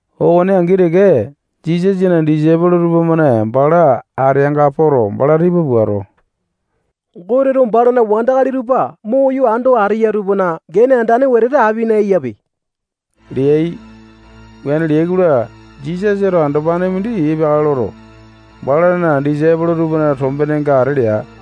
Okone angi teke, Jisasana disaipolo tupamane bala ateanga poto, bala tipa puato, Goteto balana wandakali tupa moyo ando ateya tupana gene andane wetete apina eyape leai. Wuane leai-kola, Jisasato andopane mindi epeakale loto, balana disaipolo tupana tombenenga ata lea.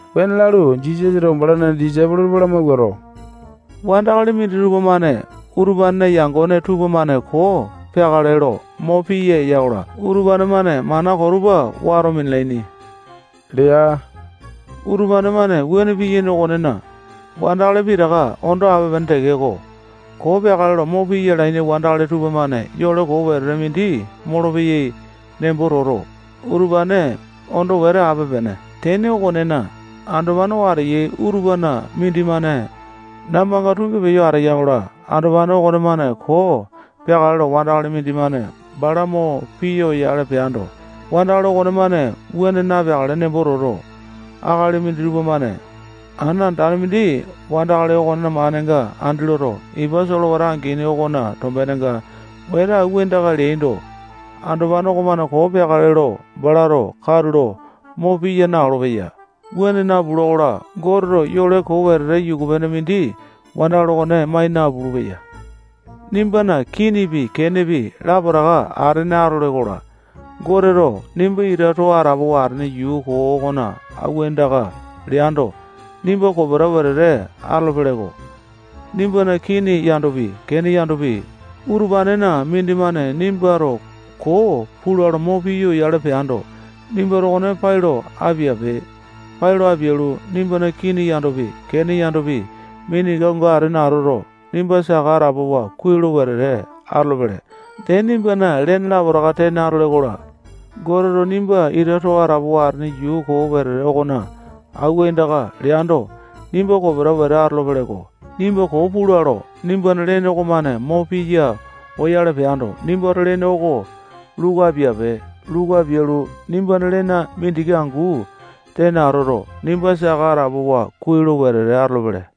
Wuane lalu, Jisasato balana disaipolo tupa lamawuato, wandakali minditupa-mane utupanena yangone tupamane koo peakale lo mo piya eyai-kola, utupane-mane mana koo tupa wato minalaini lea. Utupane-mane wuane piyaini okonena, wandakali pitaka ondo ape-pene tekeko, koo peakale lo mo piya alaini wandakali tupamane yole koo wetete mindi molopeyai nembo toto, utupane ondo wete ape-pene. Tene okonena, andopane oo ateyai utupana mindimane nambanga tungi peyo ateya-kola, andopane okonemane koo peakale lo wandakali mindimane bala mo piya oyale peando, wandakali okonemane wuane napeakale nembo toto, akali minditupa-mane ana andane mindi wandakali okonena manenga andi loto, ipa solewata angini okona tombenenga wete awua aindaka leaindo, andopane okonemane koo peakale lo balato katulo mo piya na-olopeya. Wuane napula-kola, Goteto yole koo wetete yuku-pene mindi wandakali okone mai napulu-peya. Nimbana kinipi, kenepi, lapotaka atene atole-kola, Goteto nimba ita too atapowa atene yuu koo okona awua aindaka leando, nimba kopeta wete atolo-peleko. Nimbana kini yandopi, kene yandopi, utupanena mindimane nimbato koo pula lo mo piya oyale peando, nimbato okone pai lo apiape. Pai lo apialu, nimbana kini yandopi, kene yandopi, mindiki angu atene atoto, nimba saka atapowa kuai lo wete atolopele. Dee, nimbana lene lapotaka tene atole-kola, Goteto nimba ita too atapowa atene yuu koo wetete okona awua aindaka leando, nimba kopeta wete atolopele-ko. Nimbato koo pula lo nimbana lene okomane mo piya oyale peando, nimbato lene okone luku apiape. Luku apialu, nimbana lene mindiki angu tene atoto, nimba saka atapowa kuai lo wete atolopele.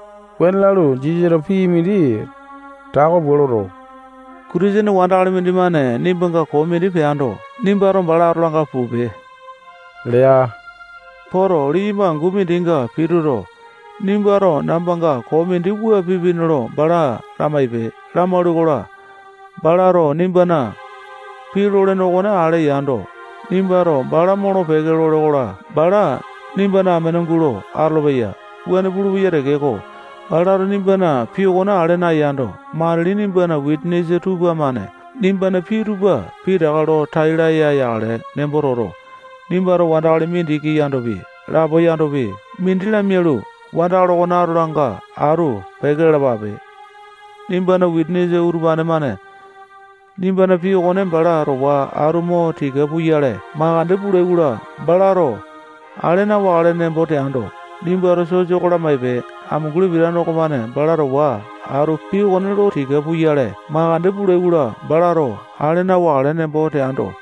Wuane lalu, Jisasato pii mindi tako pua loto, Kitisene wandakali mindimane nimbanga koo mindi peando, nimbato bala atolanga pupe lea. Poto, liyamba angu mindinga pituto, nimbato nambanga koo mindi wua pipini lo bala lamaipe. Lamaule-kola, balato nimbana pii lolene okone ale yando, nimbato bala molo-peke lole-kola, bala nimbana amene gulo atolopeya. Wuane pulupeya tekeko, balato nimbana pii okone ale nayando, matili nimbana wisanisa tupamane nimbana pii tupa pitaka lo tai laya yakale nembo toto, nimbato wandakali mindiki yandopi, lapo yandopi, mindi lamialu, wandakali okone atolanga atu peke lalapape. Nimbana wisanisa tupamane nimbana pii okone bala towa atu mo tika puyale makande pulai-kola, balato ale na-wakale nembo teando, nimbato sosa oko lamaipe. Amunguli pitane okomane bala towa atu pii okone lo tika puyale makande pulai-kola, balato ale na-wakale nembo teando,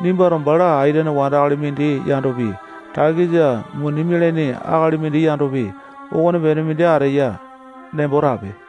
nimbato bala aitene wandakali mindi yandopi, takisa muni mialane akali mindi yandopi, okonepene mindi ateya nembo tape.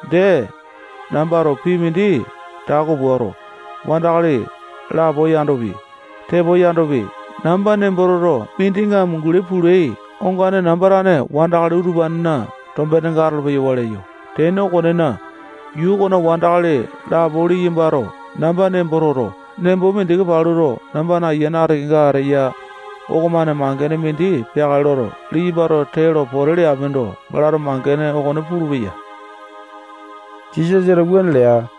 Dee, nambato pii mindi tako puato, wandakali lapo yandopi, tepo yandopi, namba nembo toto, mindinga amunguli pulai ongane namba tane wandakali utupanena tombenenga atolo-peyawa leyo. Tene okonena, yuu okona wandakali lapo liyambato namba nembo toto, nembo mindiki paluto, nambana ayiane ati kenga ateya okomane mangene mindi peakale loto, liyambato tee lo pote leapindo, balato mangene okone pulupeya. Jisasato wuane lea.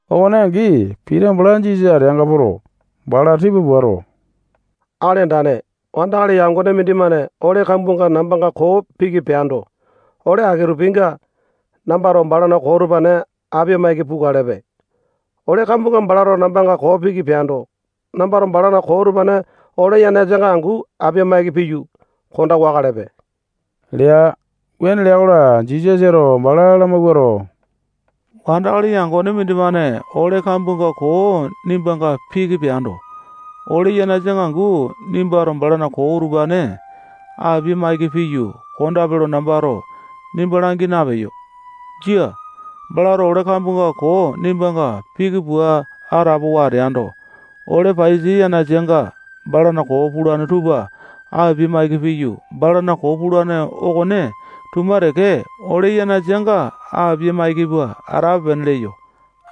Okone angi, Pita bala Jisasa ateanga poto, bala tipa puato, Akali Andane, wandakali yangone mindimane ole kambuanga nambanga koo piki peando, ole aki-tupinga nambato balana koo utupane apia-maiki pukalepe. Ole kambuanga balato nambanga koo piki peando, nambato balana koo utupane ole yanasanga angu apia-maiki piyu, konda wakalepe lea. Wuane lea-kola, Jisasato bala lamawuato, wandakali yangone mindimane ole kambuanga koo nimbanga piki peando, ole yanasanga angu nimbato balana koo utupane apia-maiki piyu, kondape lo nambato nimba langi napeyo. Jia. Balato ole kambuanga koo nimbanga piki pua atapowa ateando, ole paiyasa yanasanga balana koo pulane tupa apia-maiki piyu, balana koo pulane okone tuma teke ole yanasanga apia-maiki pua atape-pene leyo.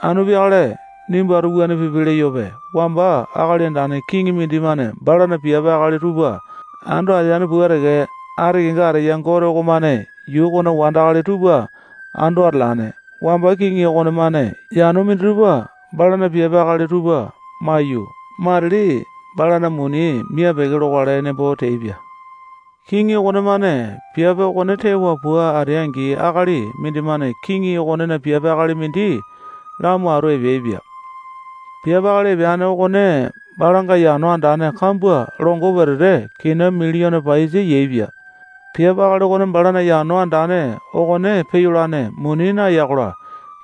Anu peakale nimbato wuane pipe leyope. Wamba akali andane kiŋi mindimane balana piape akali tupa ando ateane pua teke, ati kenga ateya Gote okomane yuu okona wandakali tupa ando atalane. Wamba kiŋi okonemane yano minditupa balana piape akali tupa maiyu, matili balana muni mia-peke lokale nembo teaipia. Kiŋi okonemane piape okone tewa pua atea-angi, akali mindimane kiŋi okonena piape akali mindi lamo atu epeaipia. Piape akali epeane okone balanga yano andane kambua longo wetete kina miliyone paiyasa yaepia. Piape akali okone balana yano andane okone peyolane muni naya-kola,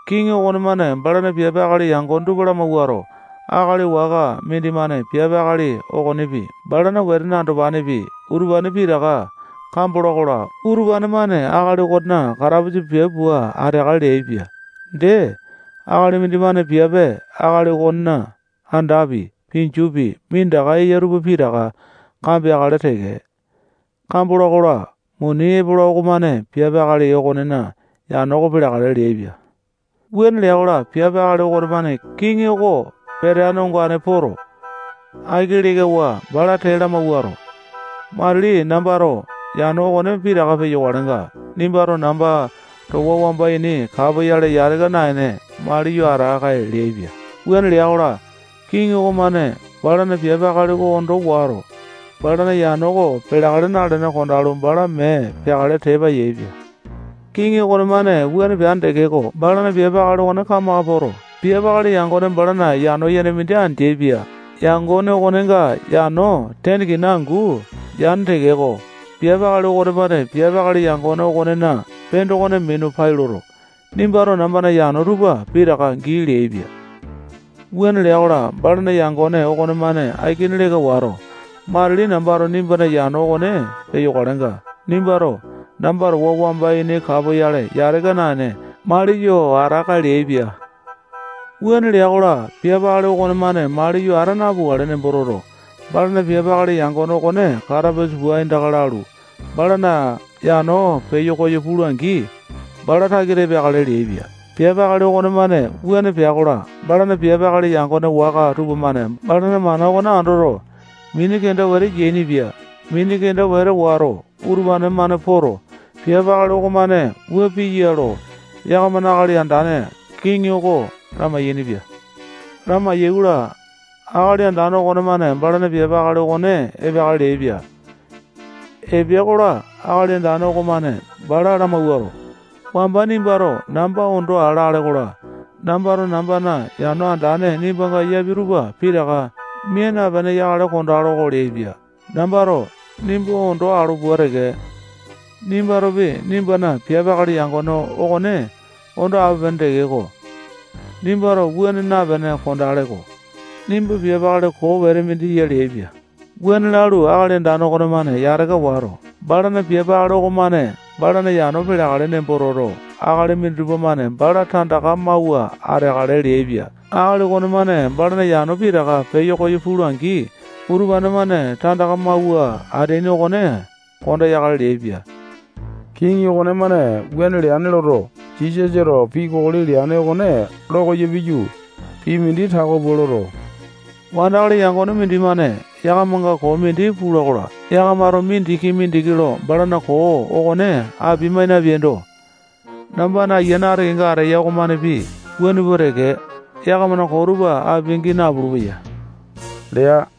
kiŋi okonemane balana piape akali yangone tupa lamawuato, akali waka mindimane piape akali okonepi, balana wetene andopanepi, utupane pitaka kambola-kola, utupane-mane akali okonena katapusa piape pua ateakale leaipia. Dee, akali mindimane piape akali okonena andapi, pinjupi, minditaka eya tupa pitaka kambeakale teke. Kambola-kola, muni epola okomane piape akali okonena yano oko peleakale leaipia. Wuane lea-kola, piape akali okonemane kiŋi oko peteane ongane poto, aiki lekawa, bala tee lamawuato, matili nambato yano okone pitaka peyokalenga, nimbato namba towa wamba ini kapoyale yataka naene, maliyo ata-kae leaipia. Wuane lea-kola, kiŋi okomane balana piape akali okone ondo wato, balana yano oko peleakale nalene kondalu, bala mee peakale tepa yaepia. Kiŋi okonemane wuane peane tekeko, balana piape akali okone kamaka poto, piape akali yangone balana yano yene mindi andeaipia. Yangone okonenga yano tene kina angu yane tekeko, piape akali okonemane piape akali yangone okonena pendokone mina pai loto, nimbato nambana yano tupa pitaka gii leaipia. Wuane lea-kola, balana yangone okonemane aikini leka wato, matili nambato nimbana yano okone peyokalenga, nimbato namba towa wamba ini kapoyale yataka naene, maliyo ata-kae leaipia. Wuane lea-kola, piape akali okonemane maliyo ata napukale nembo toto, balana piape akali yangone okone katapusa pua aindaka lalu, balana yano peyo koyo pula-angi, bala takita epeakale leaipia. Piape akali okonemane wuane pea-kola, balana piape akali yangone waka tupamane balana mana okone andoto, mini kenda wete yainipia. Mini kenda wete wato, utupane-mane poto, piape akali okomane wuane piya lo yakamana akali andane kiŋi oko lamai-yainipia. Lamai-yaikola, akali andane okonemane balana piape akali okone epeakale leaipia. Epea-kola, akali andane okomane bala lamawuato, wamba nimbato namba ondo aa lale-kola, nambato nambana yano andane nimbanga yapia tupa pitaka mia napene yakale kondalo-ko leaipia. Nambato nimba ondo alo pua teke, nimbatopi nimbana piape akali yangone okone ondo ape-pene tekeko, nimbato wuane napene kondele-ko. Nimba piape akali koo wete mindi ya leaipia. Wuane lalu, akali andane okonemane yataka wato, balana piape akali okomane balana yano peleakale nembo toto, akali minditupa-mane bala tandaka mawua ateakale leaipia. Akali okonemane balana yano pitaka peyo koyo pula-angi, utupane-mane tandaka mawua ateaini okone kondeakale leaipia. Kiŋi okonemane wuane leane loto, Jisasato pii kokoli leane okone lo koyo piyu, pii mindi tako pua loto, wandakali yangone mindimane yakamanga koo mindi pula-kola, yakamato mindiki-mindiki lo balana koo okone apia-mai napeaindo, nambana ayiane ati kenga ateya okomanepi wuane pua teke, yakamana koo tupa apia-gii napulu-peya lea.